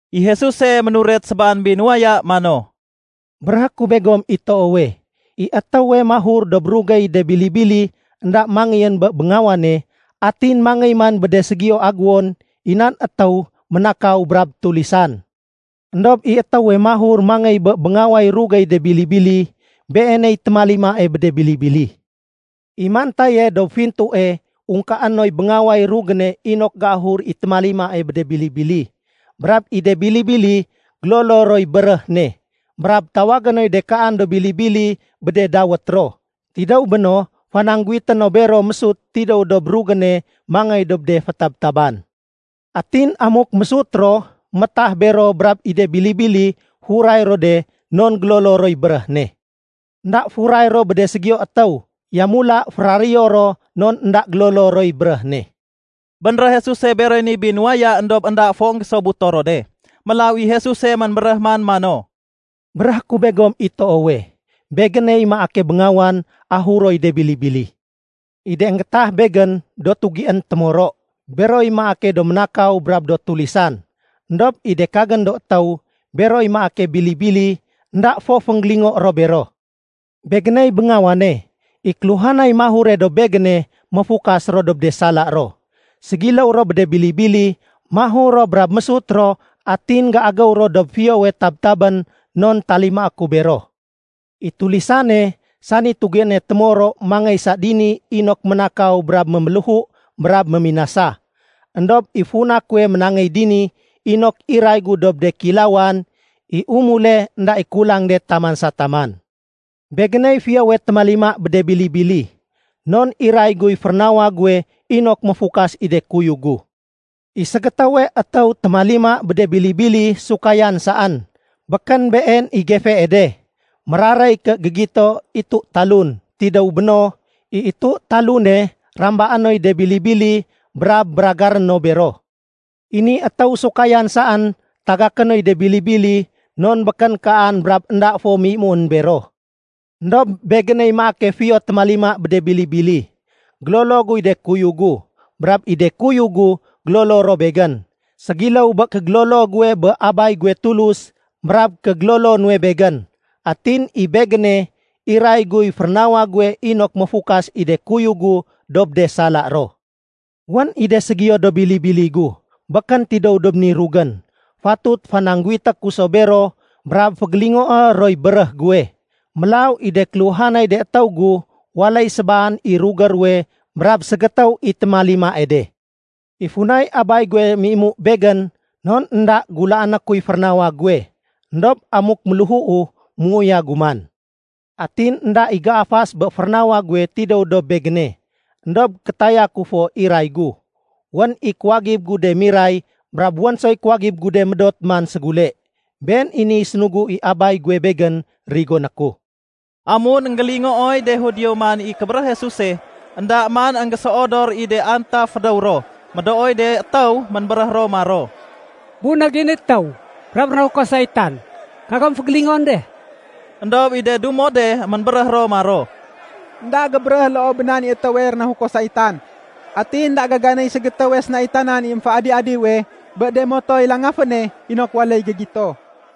I Jesuse, ménuret sébaan binuwaya mano, “Béréhé ku begom i toowe, i étéwe mahur dob rugéy de bili-bili énda mangéyén bé béngawane atin mangéy man bé de ségiyo agéwon, i nan étéw ménakaw brab tulisan. Endob i étéwe mahur mangéy bé béngaway rugéy de bili-bili, beeney témalimae bé de bili-bili. I mantaye dob fintue ungkaé noy béngaway rugéne inok géahur i témalimae bé de bili-bili. Brab i de bili-bili gélolo roy béréh ne. Brab tawagé noy de kaan do bili-bili bé de dawét ro. Tidéw béno, fanangguwité no bero mésut tidéw dob rugéne mangéy dob de fétabtaban. Atin amuk mésut ro, métah bero brab i de bili-bili furay ro de non gélolo roy béréh ne. Enda furay ro bé ségiyowe étéw, yamula féraréyo ro non énda gélolo roy béréh ne.” Bénréh Jesuse beroy ni binuwaya éndob énda fo énggésobuto ro de. Mélaw i Jesuse ménbéréh man mano, “Béréhé ku begom i toowe, Begéney maake béngawan ahuroy de bili-bili. I de énggéétah Begén do tugién témoro, beroy maake do ménakaw brab do tulisan. Endob i de kagén do étéw, beroy maake bili-bili, énda fo fénggélingo ro bero. Begéney béngawane. I kéluhanay mahure dob Begéne, méfukas ro dob de sala ro. Ségiléw ro bé de bili-bili, mahur ro brab mésut ro atin géagéw ro dob fiyowe tabtabén non talimaé ku bero. I tulisane, sani tugiéne témoro mangéy sa dini inok ménakaw brab méméléhu brab méminasa. Endob i funa kuwe ménangéy dini inok iray gu dob de kéilawan i umule énda i kulang de taman sa taman. “Begéney fiyowe témalima bé de bili-bili, non iray guy férénawa guwe inok méfukas i de kuyug gu. I ségétéwe étéw témalima bé de bili-bili sukayan saén, békén been i gefee de, méraréy ké gégito itu-talun. Tidéw béno, i itu-talune rambaé noy de bili-bili brab béragaré no bero. I ni étéw sukayan saén tagaké noy de bili-bili non békén kaan brab énda fo méimuén bero. Endob Begéney maake fiyo témalima bé de bili-bili. Gélolo guy de kuyug gu, brab i de kuyug gu gélolo ro Begén, ségiléw bé kégélolo guwe bé Abay guwe Tulus brab kégélolo nuwe Begén. Atin i Begéne iray guy férénawa guwe inok méfukas i de kuyug gu dob de sala ro. Wén i de ségiyo do bili-bili gu békén tidéw dob ni rugén. Fatut fanangguwité ku so bero brab fégélingoé roy béréh guwe. Mélaw i de kéluhanay de étéw gu, waléy sébaan i rugé ruwe brab ségétéw i témalimae de. “I funay Abay guwe méimu Begén, non énda gulaané kuy férénawa guwe. Endob amuk méléhuu, méuyagu man. Atin énda i géafas bé férénawa guwe tidéw dob Begéne, éndob kétaya ku fo iray gu. Wén i kuwagib gu de miray brab wén soy kuwagib gu de médot man ségule. Been i niy sénugu i Abay guwe Begén rigoné ku.” Amun énggélingooy de Judio man i kébéréh Jesuse, énda man énggéséodor i de antaf fédéw ro. Médooy de étéw, ménbéréh ro maro, “Bunég i ni étéw brab rénahuko saitan. Kagom fégélingoén de.” Endob i de dumo de ménbéréh ro maro, “Enda gébéréh loo bé nan i étéwe rénahuko saitan. Atin énda gaganéy ségétéwe sénaitanan i émféadi-adiwe bé de motoy langaféne inok waléy gégito.”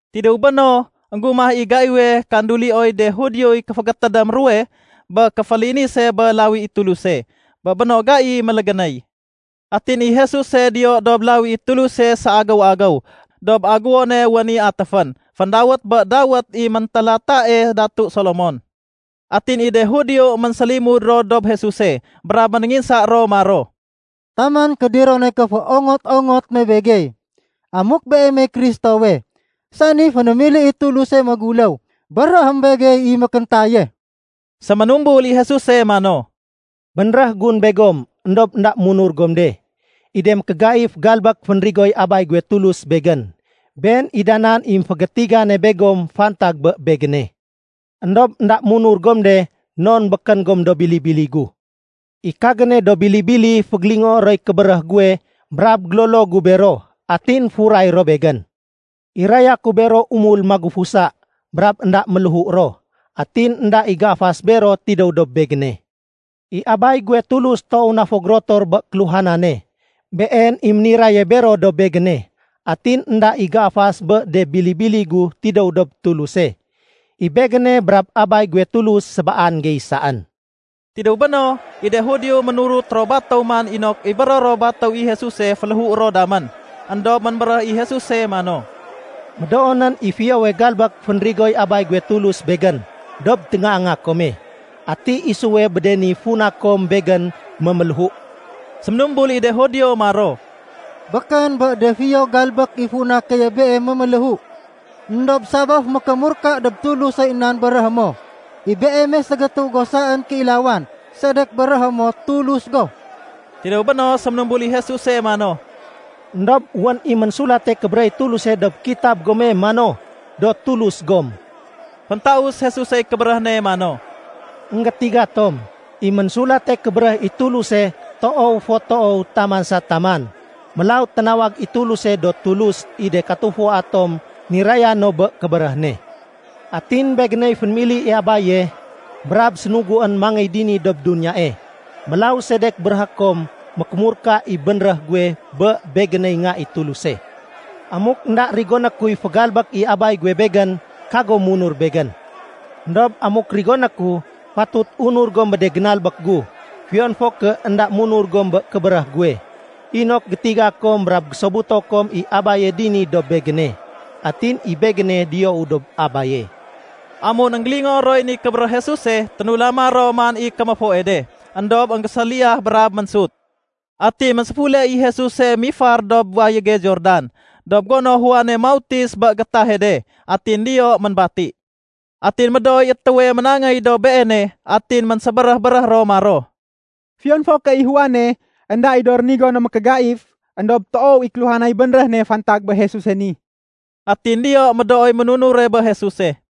Tidéw béno, énggumah i gaiwe kandulioy de Judioy kéfégétédém ruwe bé kéfélinise bé lawi i Tuluse. Bé béno, gai mélégénéy. Atin i Jesuse diyo dob lawi i Tuluse séagéw-agéw dob agéwone wén i atéfén, féndawét bé dawét i méntélatae datu Solomon. Atin i de Judio ménsélimud ro dob Jesuse brab ménénginsa ro maro, “Taman kédiron nay kéféongot-ongot me begey? Amuk Beemey Kristowe, san i fénémili i Tuluse méguléw, béréhém begey i mékéntaye.” Séménumbul i Jesuse mano, “Bénréh gun begom éndob énda munur gom de. I de mékégaif galbék fénrigoy Abay guwe Tulus Begén, been i da nan i émfégétigane begom fantag bé Begéne. Endob énda munur gom de non békén gom do bili-bili gu. I kagéne do bili-bili fégélingoé roy kébéréh guwe brab gélolo gu bero, atin furay ro Begén. Iraya ku bero umul magufusa, brab énda méléhu ro. Atin énda i géafas bero tidéw dob Begéne. I Abay guwe Tulus toow na fo gérotor bé kéluhanane. Been i méniraye bero dob Begéne. Atin énda i géafas bé de bili-bili gu tidéw dob Tuluse. I Begéne brab Abay guwe Tulus, sébaan gey saén.” Tidéw béno, i de Judio ménurut ro batéw man inok ibéro ro batéw i Jesuse féléhué ro damén. Endob ménbéréh i Jesuse mano, “Médoonén i fiyowe galbék fénrigoy Abay guwe Tulus Begén dob téngaanga kome. Ati isuwe bé de ni funa kom Begén méméléhu?” Séménumbul i de Judio maro, “Békén bé de fiyo galbék i funa keye Beem méméléhu, éndob sabaf mékémurka dob Tulusoy nan béréhé mo. I Beeme ségétéw go saén kéilawan, sedek béréhé mo Tulus go?” Tidéw béno, séménumbul i Jesuse mano, “Endob wén i Ménsulate Kébéréh i Tuluse dob Kitab gome mano, ‘Do tulus gom.’” Féntaus Jesusey kébéréh ne mano, “Enggétiga tom, i Ménsulate Kébéréh i Tuluse toow fo toow taman sa taman. Mélaw ténawag i Tuluse do tulus i de katufua tom niraya no bé kébéréh ne. Atin Begéney fénémili i Abaye brab sénuguén mangéy dini dob duniyae. Mélaw sedek béréhé kom mékémurka i bénréh guwe bé Begéney Nga i Tuluse. Amuk énda rigoné kuy fégalbék i Abay guwe Begén, kagom munur Begén. Endob amuk rigoné ku, fatut unur gom bé de génalbék gu, fiyon fo ké énda munur gom bé kébéréh guwe, inok gétiga kom brab gésobuto kom i Abaye dini dob Begéne, atin i Begéne diyou dob Abaye.” Amun énggélingoo roy ni kébéréh Jesuse, ténulama ro man i kéméfoe de, éndob énggéséliyah brab ménsut. Atin ménséfule i Jesuse mifar dob wayége Jordan dob gono Juane mautis bé gétahe de. Atin diyo ménbati. Atin médooy étéwe ménangéy dob Beene. Atin ménsébéréh-béréh ro maro, “Fiyon fo ké i Juane énda i do rénigo no mékégaif, éndob toow i kéluhanay bénréh ne fantag bé Jesuse ni.” Atin diyo médooy ménunure bé Jesuse.